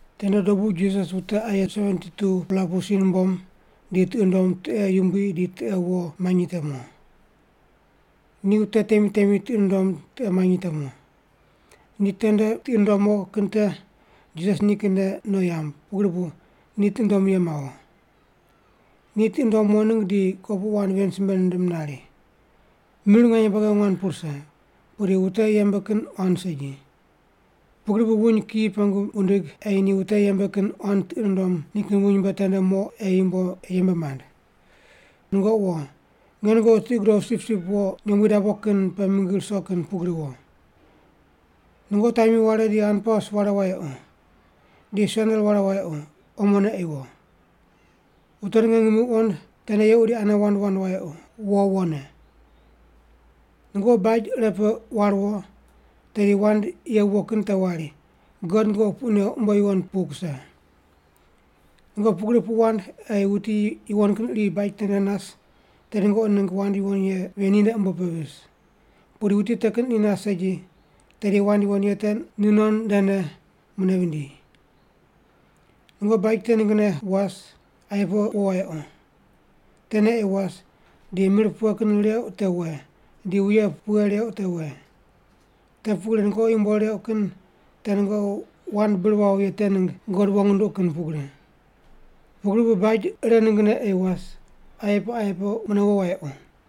Tende dobu Jisas wute aye 72-pela pu si numbom di tiqi nundom tiqe yumbui di tiqe wo manyi te mo. Ni wute temi temi tiqi nundom tiqe manyi te mo. Ni tende tiqi nundom mo kin te Jisas nikinne no yamb, pugri bu ni tiqi nundom ye mawo. Ni tiqi nundom mo ningg di kopuqu wand ven simbe nindim nari, “Mir nganye buagi nguan pu rise, pudi wute yembe kin quan segi. Pugri bu wuny kiyi pengu wundig ei ni wute yembe kin quan tiqi nundom nikin wuny mbe tende mo ei yembe mand. Nungoqi wo. Nge nungoqi tiqi gudoqu sipsip wo nyombui dabo kin pe mingi ruso kin pugri wo. Nungoqi tami ware di hanpaus ware wayequ. Di sendel ware wayequ, omone ei wo. Wute ninge ngimi wuqond tende yequ di ane wand wand wayequ, wo wone. “Nungoqi baj ire pe war wo, tedi wand ye viwo kin te wari, ‘God nungoqi puq neuq umbo yuwon pu kuse.’ Nungoqi pugri puq wand ei wuti yuwon kin iri baj tende nas, tedi nungoqi ningg wand yuwon ye ven ninde umbo pe vis. Pudi wuti te kin iri nas segi, tedi wand yuwon ye te nu non ndene mune vindi. Nungoqi baj te ninggne was, aye pe wo wayequ. Tene ei was, di mir pughene reuq te we, di wuye pughe reuq te we. Te pugri nungoqi yumbo reuq kin te nungoqi wand bir wawo ye te ningg God wong nunduqu kin pugri. Pugri bu baj ire ninggne ei was, aye pe aye pe mune wo wayequ.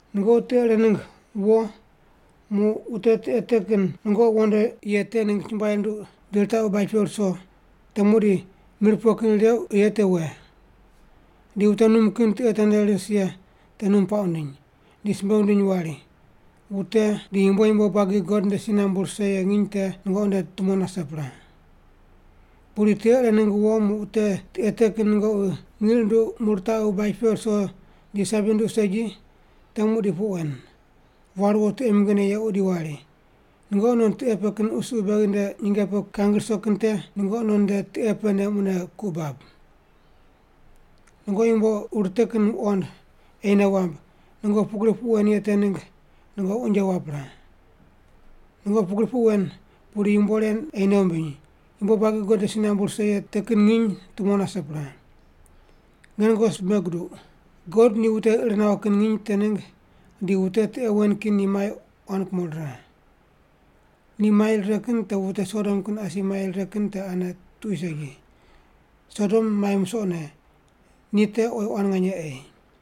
“Nungoqi tiqe ire ningg wo muq wute tiqe te kin nungoqi wondo ye te ningg chumbuai rinduq di ritaqu baj pe ruso, te muqdi mir pughe kin reuq ye te we. Di wute num kin tiqe tende ris ye te num puaq wundiny, di simbe wundiny wari, ‘Wute di yumbo yumbo buagi God nde si nambu rise ye nginy te nungoqi nde tumo nase pre.’ Pudi tiqe ire ningg wo muq wute tiqe te kin nungoqi ngiq runduq muq ritaqu baj pe ruso di sabi runduq segi, te muqdi puq wen: War wo tiqe mingine yequ di wari, ‘Nungoqi non tiqe pe kin qusuqu beghi nde nyinge pe kangi ruso kin te nungoqi non nde tiqe pene mune ku bab. Nungoqi yumbo ur te kin wuqond ei nei wamb, nungoqi pugri puq wen ye te ningg nungoqi unje wap pre. Nungoqi pugri puq wen, pudi yumbo ren ei nei wumbiny, yumbo buagi God nde si nambu rise ye te kin nginy tumo nase pre!’ Nge nungoqi simbe guduq, God ni wute ir nawo kin nginy te ningg di wute tiqe wen kin ni mai quan kumo rire. Ni mai rire kin te wute Sodom kin asi mai rire kin te ane tuqui segi. Sodom mai musoqne, ni te oyi quan nganye ei.”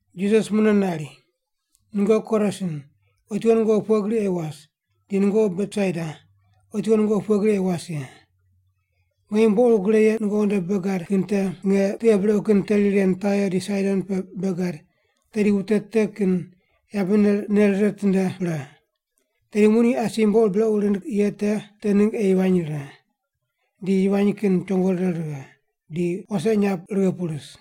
Jisas ni mune nari, “Nungoqi Korasin, otiwo nungoqi pughe gri ei was, di nungoqi Betsaida, otiwo nungoqi pughe gri ei was ye. Nge yumbo ur gre ye nungoqi nde bei gad kin te nge tiqe brequ kin teri ren Tair di Saidon pe bei gad, tedi wute te kin yabene nei rire ritinde pre. Tedi muq ni asi yumbo ur brequ rind ye te ningg ei yivany rire, di yivany kin chongo rire righe, di wase inyap righe pu ris.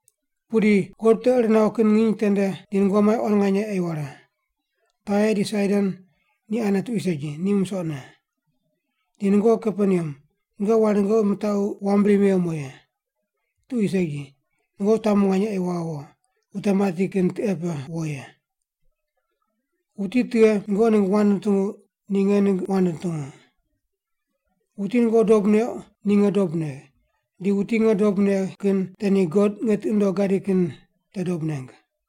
Pudi God wute ir nawo kin nginy tende di nungoqi mai quan nganye ei ware. Tair di Saidon ni ane tuqui segi, ni musoqne. Di nungoqi Kaperneam, nungoqi wari nungoqi mitaqu wam bri mewo mo ye? Tuqui segi. Nungoqi tamu nganye ei waghe wo, wute mati kin tiqe pe wo ye. “Wuti tughe nungoqi ningg wand nutungu, ni nge ningg wand nutungu. Wuti nungoqi dob neuq, ni nge dob negh, di wuti nge dob negh kin te ni God nge tiqi nundogh gadi kin te dob neng.”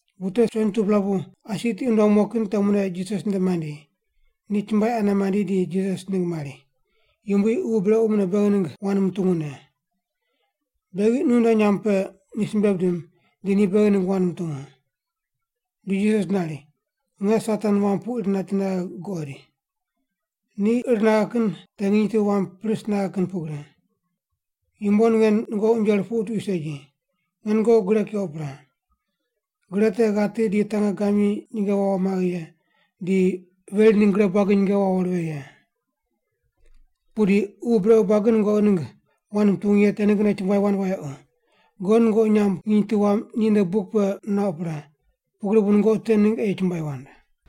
Wute 72-pela pu asi tiqi nundom mo kin te mune Jisas nde mandi. Ni chumbuai ane mandi di Jisas ningg mari, “Yumbui, ququ brequ mune beghi ningg wand mutungu ne. Beghi nu nde nyamb pe ni simbe bidim, di ni beghi ningg wand mutungu.” Di Jisas nari, “Nge Satan wam pu ir nati naghe guqoid. Ni ir naghe kin te nginy tu wam pris naghe kin pugri. Yumbo ninge nungoqi unje rupuqu tuqui segi. Nge nungoqi gre keuq pre. Gre te ghati di tangegamyi nyinge wawo maghe ye, di veri ningg gre buagi nyinge wawo righe ye. Pudi ququ brequ buagi nungoqi ningg wand mutungu ye te ninggne chumbuai wand wayequ; God nungoqi nyamb nginy tu wam ni nde buk pe nuauq pre, pugri bu nungoqi te ningg ei chumbuai wand.”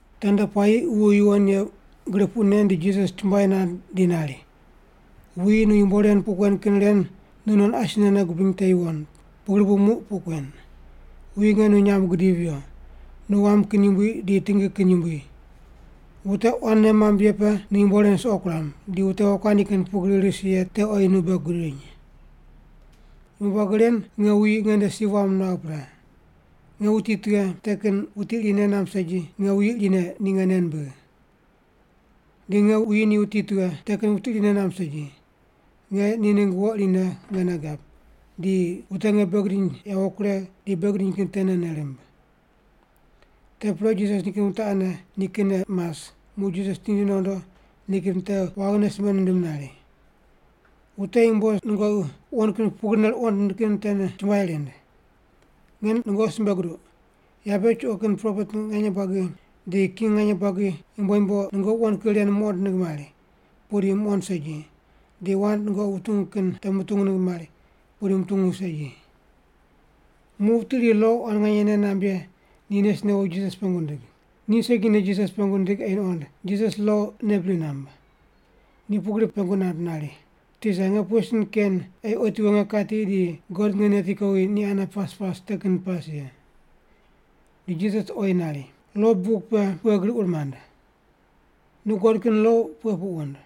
Tende puayi Ququ Yuwon Ye gri puq nen di Jisas chumbuai nand di nari, “Wuyi nu yumbo ren puq kuen kin ren nu non asine nei gubiny te yuwon, pugri bu muq puq kuen: Wuyi nge nu nyamb gidivi viyo. Nu wam kin yumbui di tingi kin yumbui. Wute quan nei mamb ye pe nu yumbo ren suqo kuram, di wute wokuandi kin pugri ris ye te oyi nu bei gudiny. “Yumbo buagi ren nge wuyi nge nde si wam nuagh pre. Nge wuti tughe, te kin wuti iri nei namb segi, nge wuyi irine ni nge nei nimbigh. Di nge wuyi ni wuti tughe, te kin wuti iri nei namb segi, nge ni ningg wo irine nge nei gab, di wute nge bei gidiny yawo kuregh di bei gidiny kin tene nei rimb.” Te pre Jisas nikin wute ane ni kinne mas, muq Jisas tindi nondo nikin wute waghine simbe nindim nari, “Wute yumbo nungoqi wuqond kin pugrine ruqond kin te chumbuai rind. Nge nungoqi simbe guduq, yabe chuqo kin propet nganye buagi di king nganye buagi yumbo yumbo nungoqi wuqond kin ren muqond ningg mari, pudi muqond segi, di wand nungoqi wutungu kin te mutungu ningg mari, pudi mutungu segi.” Muq wuti iri lo quan nganye nei namb ye ni nes newo Jisas pengu nindig. Ni segine Jisas pengu nindig ei nuqond Jisas lo nei bri namb. Ni pugri pengu nand nari, “Tisa, nge pughe sin ken ei otiwo nge kati di God nge neti kowi ni ane pas pas te kin pas ye?” Di Jisas oyi nari, “Lo buk pe pughe gri ur mand? Nu guqod kin lo pughe puq wund?”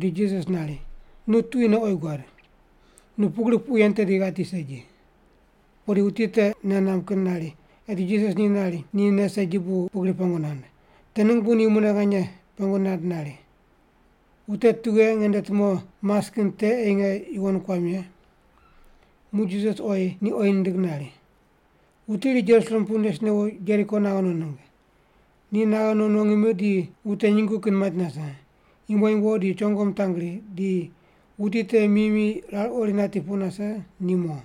Di Jisas nari, “Nu tuquine oyi guad. Nu pugrine puq yen tedi ghati segi.” Pudi wuti te nei namb kin nari eti Jisas ni nari ni nei segi bu pugri pengu nand. Te ningg bu ni mune nganye pengu nand nari, “Wute tughe nge nde tumo mas kin te ei nge yuwon kuam ye?” Muq Jisas oyi ni oyi nindig nari, “Wuti iri Jerusalem pu nes newo Jeriko naghe no ningg. Ni naghe no no ngimi di wute nyungu kin mait nase, yumbo yumbo di chongo mitangri, di wuti te mi mi rar ori nati pu nase ni mo.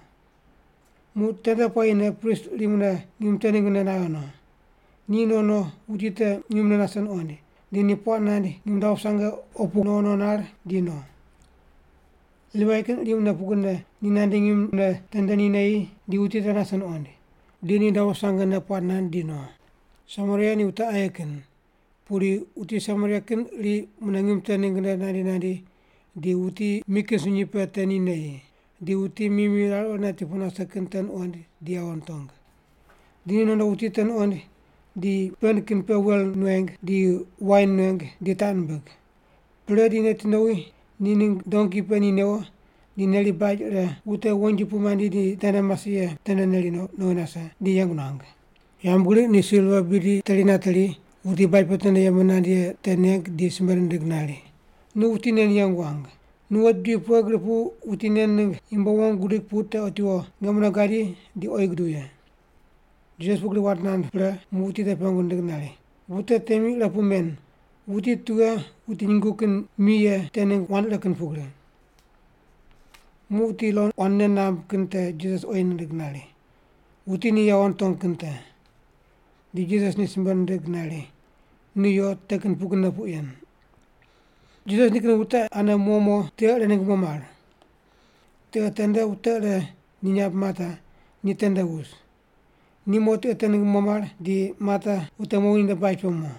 Muq tende puayine prist iri mune ngim te ninggne naghe no. Ni no no, wuti te ngimne nase nuqoind, di ni puaq nand ngim dabo sange opu gri no no nar di no. Livai kin iri mune pugrine, ni nandi ngimne tende ni neyi di wuti te nase nuqoind. Di ni dabo sangene puaq nand di no. Samaria ni wute aye kin. Pudi wuti Samaria kin iri mune ngim te ninggne nandi nandi, di wuti mi kin sunyi pe tende ni neyi. Di wuti mi mi rar ori nati pu nase kin te nuqoind di yawo nitong. Di ni nondo wuti te nuqoind, di pend kin pe wel nueng, di wain nueng, di taq nimbig. Pre di neti nowi ni ningg donki pe ni newo, di neri baj ire wute wonji pu mandi di tende mase ye tende neri no, nowi nase, di yeng nuang. Yambgriq ni silva bidi teri nateri, wuti baj pe tende yembe nand ye te neng di simbe nindig nari, ‘Nu wuti nen yeng wang. Nu wet bidi pughe gri pu wuti nen ningg yumbo wong gudig pu te otiwo nge mune gadi di oyi guduw ye’.” Jisas pugri wand nand pre muq wuti te pengu nindig nari, “Wute temi ire pu men, wuti tughe wuti nyungu kin mi ye te ningg wand ire kin pugri?” Muq wuti lo quan nei namb kin te Jisas oyi nindig nari, “Wuti ni yawo nitong kin te.” Di Jisas ni simbe nindig nari, “Nu yo, te kin pugrine puq yen.” Jisas nikin wute ane mo mo, tiqe ire ningg mo mar. Tiqe tende wute ire ni nyamb Marta, ni tende wus. Ni mo tiqe te ningg mo mar, di Marta wute mowi ninde baj pe mo.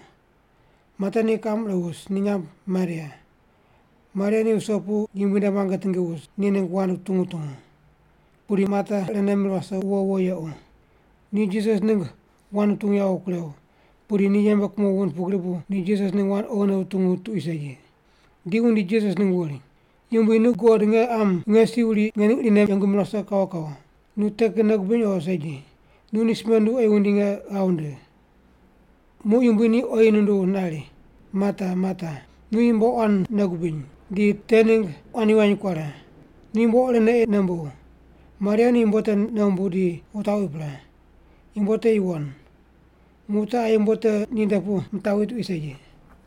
Marta ni kiqam ire wus, ni nyamb Maria. Maria ni wuso pu Yumbui nde muange tingi wus, ni ningg wand wutungu wutungu. Pudi Marta irene mir wase wuwo wuwo yequ. Ni Jisas ningg wand wutungu yawo kurew, pudi ni yembe kumo wund pugri bu ni Jisas ningg wand oghine wutungu tuqui segi. Di wundi Jisas ningg wuri, “Yumbui, nu guqod nge qam nge si wuri nge ning irine yengu mir wase kawo kawo. Nu te kin nei gubiny o segi? Nu ni simbe nduw ei wundi nge ghav wundigh.” Muq Yumbui ni oyi nunduw nari, “Marta, Marta. Nu yumbo quan nei gubiny, di te ningg quan yivany kuare. Nu yumbo irene ei nei mbuw. Maria ni yumbo te nei wumbuw di wutaqwi pre. Yumbo te yuwon. Muq wute aye yumbo te ninde pu mitaqwi tuqui segi.”